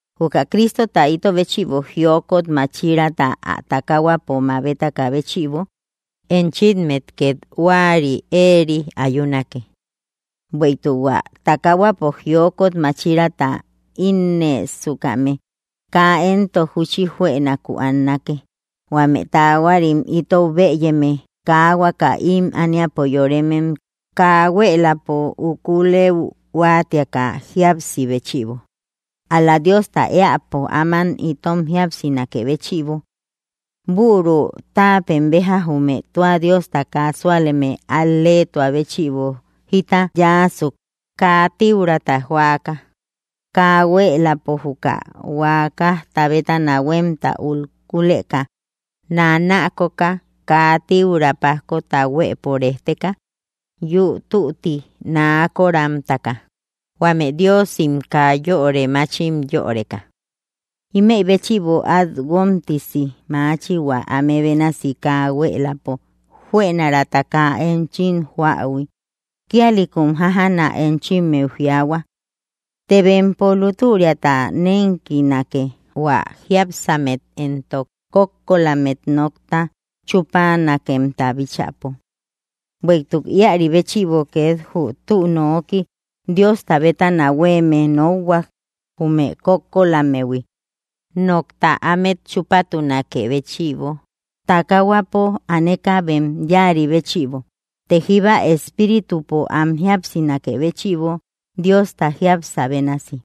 Juka Cristota ito béchïbo jiokot máchiraata ä takahuapo mabetakä béchïbo, enchimmet két huäri éeri ayunake; bueïtuk hua takahuapo jiokot máchiraata ínnësukame kaa éntok júchi juënaku annake, huame taahuarim itou bëyeme kaa huaka ím ániapo yoremem kaa huéeläpo ukulëu huáatiaka jíapsi béchïbo, ál‑la Diosta éäpo áman itom jíapsinakë béchïbo. Büru táapem béja jume tua Diosta kaa súaleme al‑leetua béchïbo jita yáasuk, kaa tíurata joaka, kaa huéeläpo juka huakajta bétana huémta ukuleka, nanaakoka, kaa tíura pájkota huëpo rejteka, yü tütti naakoramtaka, huame diosim kaa yöri mátchim yöreka. Ímëi béchïbo át guómtisi maachi hua áme bénasi kaa huéeläpo juënarata kaa enchim joähui, kíalïkum jájana enchimmeu jiaahua. Të bempo lútüriata nénkinake hua jiápsammet éntok kókkolammet nokta chúpanakemta bíchäpo. Bueïtuk íäri béchïbo két jü tü nooki Diosta bétana huéeme nokhuak jume kókkolammehui, nokta ámet chúpatunakë béchïbo takahuapo aneka bem yáari béchïbo, të jíba espíritupo am jíapsinakë béchïbo Diosta jiapsä bénasi.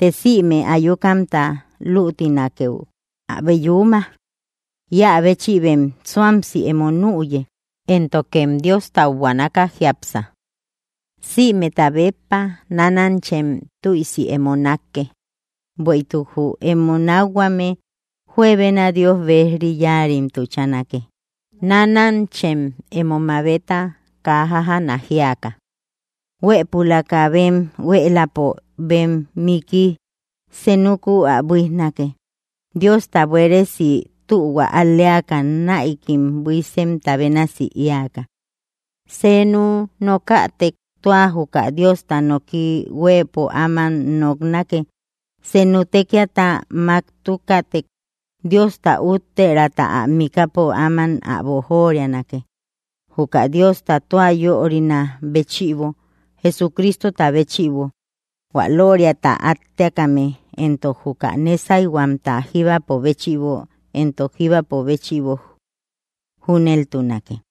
Të sïme ayukamta lütinakeu abe yuuma; íä béchïbem suamsi emo nüye, éntokem Diostau buanaka jiápsa. Sïmeta béppa nánanchem tüisi emo nákke, bueïtuk jü emo nákhuame juebena Dios bejri yáarim tuchanake. Nánanchem emo mamabeta kaa jájana jíaka. Huëpulaka bem huéeläpo bem miiki senukuu ä buíjnake, Diosta buéresi tühua al‑leaka näikim buísemta bénasi éaka. Seenu nokätek tua juka Diosta noki huëpo áman noknake; senu tékiata máktukätek Diosta úttiärata ä mikäpo áman ä boojorianake, juka Diosta tua yörinä béchïbo Jesucristota béchïbo, hua lóoriata átteakame éntok juka nésayhuamta jíbapo béchïbo éntok jíbapo béchïbo. Júneltunake.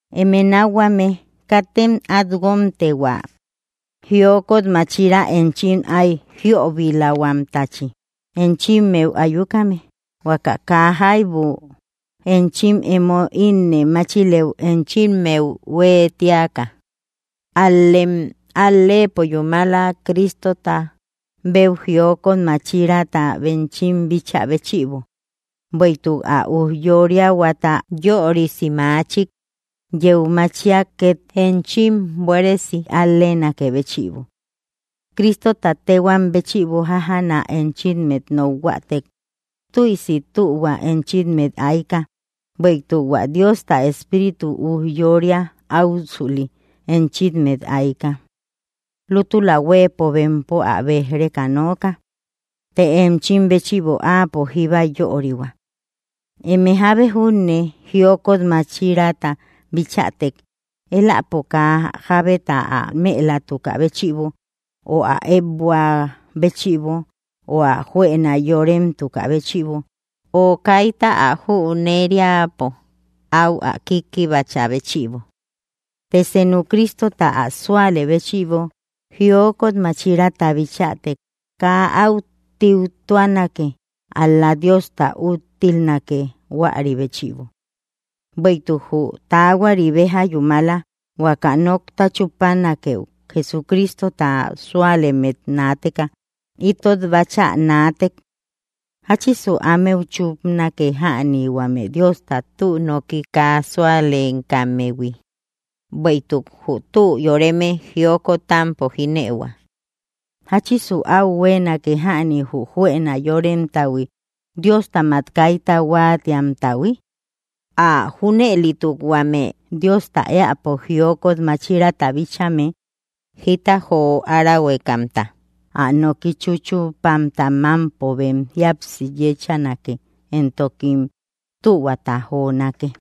Eme nákhuame, katem át guómte hua jiokot máchira enchim ay jiöbilahuamtachi enchimmeu ayukame, huaka kaa jaibu enchim emo ínnë máchilëu enchimmeu huëtiaka; ál‑lem al‑leepo yúmala Cristota béu jiokot máchiraata enchim bíchä béchïbo, bueïtuk ä ujyóriahuata yörisi machik yeu machiak két enchim buéresi al‑leenakë béchïbo. Cristota téhuam béchïbo jájana enchimmet nokhuätek, tüisi tühua enchimmet ayka, bueïtuk hua Diosta Espíritu ujyória áusüli enchimmet ayka. Lútula huëpo bempo ä béj‑reka nooka, të enchim béchïbo áapo jíba yörihua. Eme jábe junne jiokot máchiraata bichätek, éläpo kaa jábeta ä mëlatukä béchïbo, o ä ëekbuä béchïbo, o ä juëna yóremtukä béchïbo, o kaita ä jüneriäpo áu ä kikkibachä béchïbo. Të seenu Cristota ä súalë béchïbo jiokot máchiraata bichätek kaa áu tíutuanake, ál‑la Diosta úttilnake huäri béchïbo. Bueïtuk jü taahuari béja yúmala huaka nokta chúpanakeu Jesucristota súalemmet naateka. Itot báchä naatek, ¿jáchisu ámeu chúpanake jäni huame Diosta tü noki kaa súalekammehui? Bueïtuk jü tü yoreme jiokotampo jínëihua, ¿jáchisu áú huéenake jäni jü juëna yóremtahui, Diostamak kaita huáatiamtahui? Ä junëlituk huame Diosta éäpo jiokot máchiraata bíchame, jita jo árahuekamta, ä noki chúchupamta mámpo bem jíapsi yéchanake, éntokim tühuata jonake.